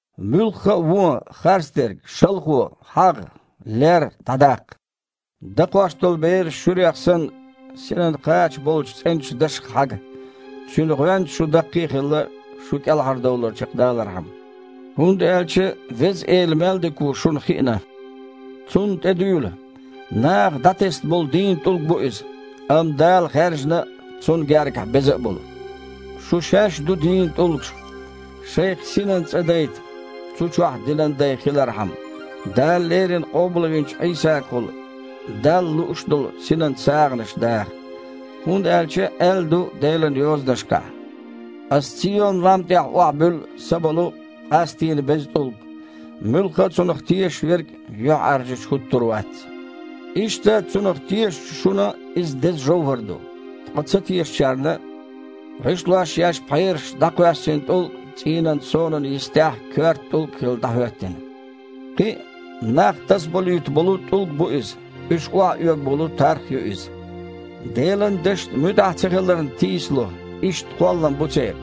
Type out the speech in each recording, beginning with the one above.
Муьлхха а вон, харцдерг, шалхо, хьагІ, лер дІадаккха! Дакхош долу бераш шуьрех санна, синан кхача болчу цІеначу дашах хьага, цуьнан гІоьнца шу даккхий а хилла, шун кІелхьардовлар чекхдалархьама, хІунда аьлча «Веза Эла мел дика ву шуна хиъна». Цунна тІе дуьйла. Наха дІатесна болу дийна ТІулг бу Иза, амма Дала хаьржина а, Цунна гергахь беза а болу. Шу шаьш а ду дийна тІулгаш. Шайх синан цІа дайта, цу чохь динан дай хилархьама, Дала леррина къобалвинчу Іийсагахула Далла лууш долу синан сагІанаш даха. ХІунда аьлча аьлла ду Делан Йозанашкахь: «Ас Цийон-лам тІехь охьабуьллу са болу, къастийна, беза тІулг. Муьлхха а Цунах тешаш верг юьхьІаьржачу хІуттур вац». Иштта, Цунах тешачу шуна Иза деза жовхІар ду, ткъа ца тешачарна: «ГІишлош еш пхьераша дІакхоьссина тІулг цІийнан сонан йистехь коьрта тІулг, хилла, дІахІоьттина». Кхин а: «Нах тасаболуьйтун болу тІулг бу иза, уьш охьаоьгун болу тарх а ю иза». Делан Дашна муьтІахь ца хиларна тийсало – иштта кхоллам бу церан.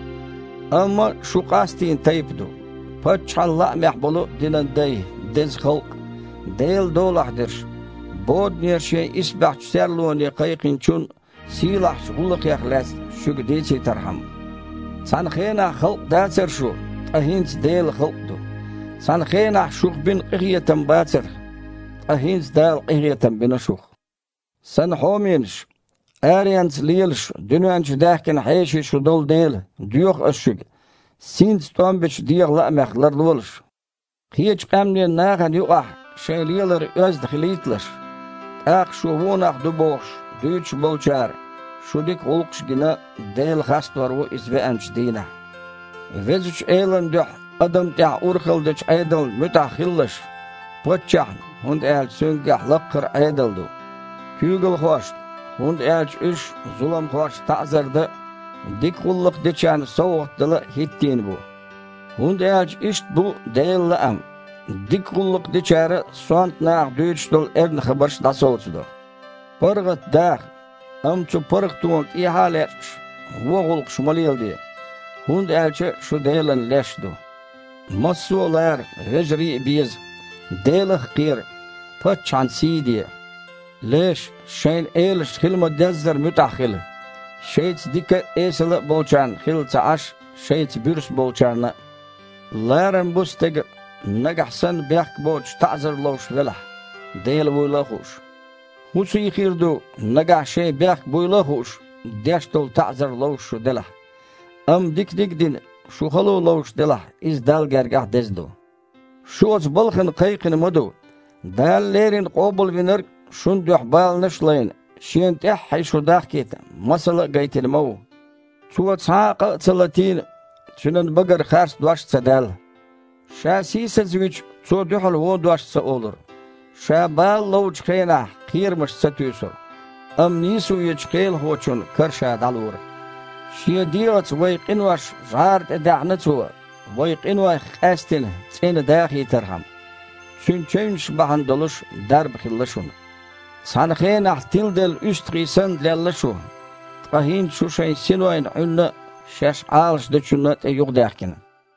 Амма шу къастийна тайпа ду, Паччахьан лаамехь болу динан дай, деза халкъ, Делан долахь дерш, боданера Шен исбаьхьчу серлоне Кхайкхинчун сийлахьчу гІуллакхех лаьцна шуьга дийцийтархьама. «Цхьана хенахь халкъ дацара шу, ткъа хІинца Делан халкъ ду. Цхьана хенахь шух бина къинхетам бацара, ткъа хІинца Дала къинхетам бина шух». Сан хьоменаш, аренца лелаш, дуьнен чу даьхкина хьеший шу долу дела, доьху ас шуьга, синца тІом бечу дегІан лаамех ларлолаш. Кхечу къаьмнийн нахана юкъахь шайн лелар оьзда хилийталаш, тІаккха, шу вон нах ду бохуш, дуьйцуш болчара, шун дика гІуллакхаш а гина, Дела хастор ву Иза веанчу дийнахь. Везачу Элан дуьхьа адамна тІехь урхалла дечу Іедална муьтІахь хилалаш: паччахьна, хІунда аьлча цуьнгахь лаккхара Іедал ду, куьйгалхошна, хІунда аьлча уьш зуламхошна таІзар дан а, дика гІуллакх дечарна совгІат дала хІиттийна бу. ХІунда аьлча иштта бу Делан лаам: дика гІуллакх дечара сонта наха дуьйцуш долу эрна хабарш дІасовцадо. ПаргІат даха, амма цу паргІатона тІехьа а лечкъаш, вон гІуллакхаш ма леладе, хІунда аьлча шу Делан леш ду. Массо а лара, вежарий а беза, Делах а кхера, паччахьан сий а де. Леш, шайн элашна хила ма-деззара муьтІахь хила, шайца дика а, эсала а болчарна хилла ца Іаш, шайца буьрса болчарна а. Ларам бу стеган, нагахь санна бехк а боцуш таІзар ловш велахь, Дела вуйла а хууш. ХІун сий хир ду, нагахь шайн бехк буйла а хууш, деш долу таІзар ловш шу делахь? Амма диканиг а дина, шу хало ловш делахь, иза Далла гергахь деза ду. Шу оцу балхана кхайкхина ма ду. Дала леррина Къобалвинарг а, шун дуьхьа баланаш а лайна, Шена тІаьххье шу дахкийта масала а гайтина ма ву. «Цо цхьа а къа а ца латийна, Цуьнан багара харц дош а ца даьлла». Ша сийсазвича, Цо дуьхьал вон дош ца олура, Ша бала ловчу хенахь, кхерамаш ца туьйсура, амма нийсо ечу Кхелахочун кара Ша дІалора. Шен дегІаца вайн къинош жІара тІе даьхьна Цо, вай къинойх къаьстина, цІена дахийтархьама. Цуьнан чевнаш бахьана долуш дарба хилла шуна. Цхьана хенахь, тиладелла уьстагІий санна, лелла шу, ткъа хІинца шу шайн синойн Іуьнна а, шаьш Іалашдечунна а тІе юхадаьхкина.